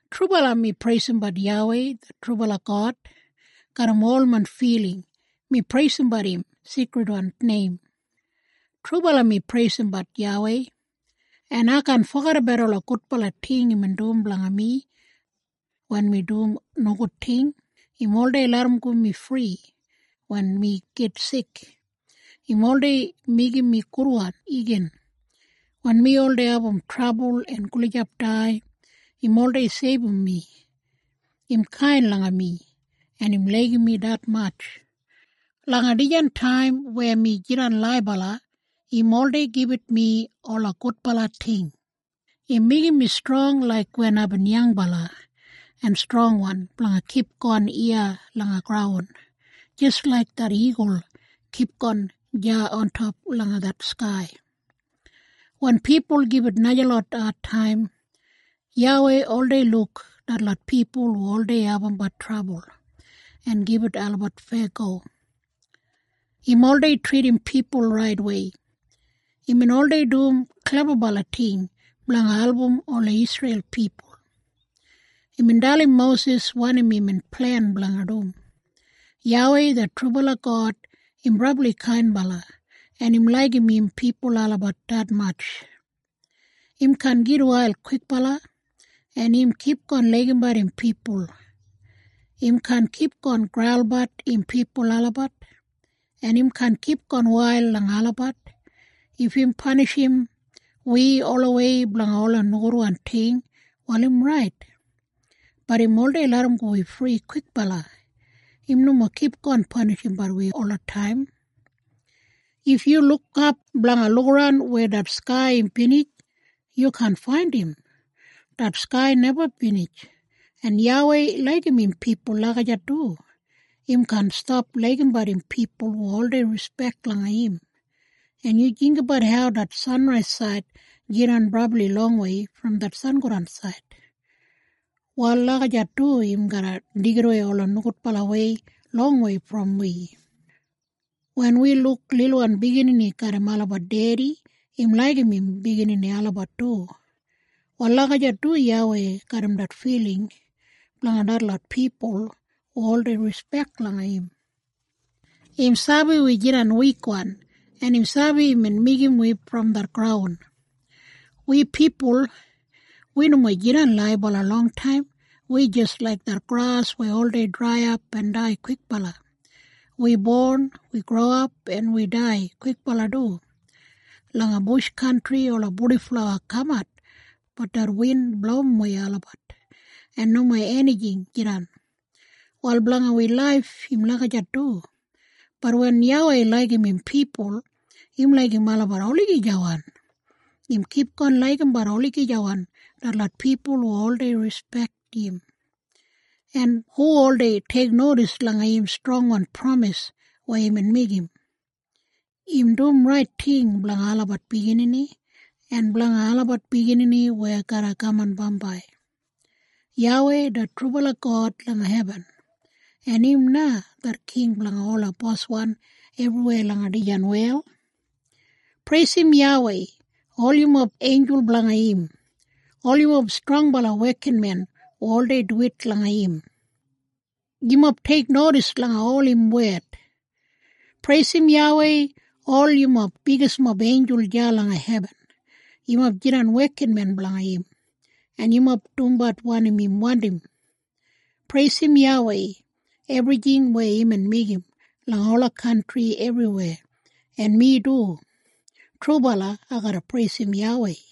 Trubala, mi preisimbat YAWEI det trubala God. Garram ol main filing mi preisimbat im seikridwan neim. Trubala, mi preisimbat YAWEI, en ai kaan fogedabat ola gudbala ting imbin dum blanga mi. Wen mi dum nogud ting, im oldei larramgo mi fri. Wen mi git sik, im oldei meigim mi gudwan igin. Wen mi oldei abum trabul en gulijap dai, im oldei seibum mi. Im kain langa mi, en im laigim mi detmatj. Langa dijan taim weya mi jidan laibala, im oldei gibit mi ola gudbala ting. Im meigim mi strong laik wen aibin yangbala, en strongwan blanga kipgon iya langa graun, jis laik det igul kipgon deya ontop langa det skai. Wen pipul gibit najalot adtaim, YAWEI oldei luk detlot pipul hu oldei abumbat trabul, en gibit olabat feyago. Im oldei tridim pipul raitwei. Imbin oldei dum klebabala ting blanga album ola Isreil pipul. Imbin dalim Mosis wanim imbin plen blanga dum. YAWEI det trubala God im brabli kainbala, en im laigim im pipul olabat detmatj. Im kaan gitwail kwikbala, en im kipgon laigimbat im pipul. Im kaan kipgon graulbat im pipul olabat, en im kaan kipgon wail langa olabat. If im panishim wi olawei blanga ola nogudwan ting, wal im rait. Bat im oldei larramgo wi fri kwikbala. Im nomo kipgon panishimbat wi olataim. If yu lukap blanga lukaran weya det skai im binij, yu kaan faindim. Det skai neba binij. En YAWEI laigim im pipul lagijat du. Im kaan stap laigimbat im pipul hu oldei rispek langa im. En yu jinggabat hau det sanraisaid jidan brabli longwei brom det sangodansaid. Wal lagijat du im garra deigidawei ola nogudbalawei longwei brom wi. Wen wi luk lilwan biginini garram olabat dedi, im laigim im biginini olabat du. Wal lagijat du YAWEI garram det filing blanga detlot pipul hu oldei rispek langa im. Im sabi wi jidan wikwan, en im sabi imbin meigim wi brom det graun. Wi pipul, wi nomo jidan laibala longtaim. Wi jis laik det gras weya oldei draiyap en dai kwikbala. Wi bon, wi growap en wi dai kwikbala du. Langa bush kantri ola purdiflawa kamat, bat det win blowimwei olabat, en nomo enijing jidan. Wal blanga wi laif im lagijat du. Bat wen YAWEI laigim im pipul, im laigim olabat olagijawan. Im kipgon laigimbat olagijawan, detlot pipul hu oldei rispek im, en hu oldei teiknodis langa im strongwan pramis weya imbin meigim. Im dum rait ting blanga olabat biginini, en blanga olabat biginini weya garra kaman bambai. YAWEI det trubala God langa hebin, en im na det king blanga ola boswan ebriweya langa dijan wel. Preisim YAWEI, ol yumob einjul blanga im, ol yumob strongbala wekinmen hu oldei duwit langa im. Yumob teiknodis langa ol im wed. Preisim YAWEI ol yumob bigismob einjul deya langa hebin. Yumob jidan wekinmen blanga im, en yumob dumbat wanim im wandim. Preisim YAWEI, ebrijing weya imbin meigim, langa ola kantri ebriweya. En mi du, trubala, ai garra preisim YAWEI.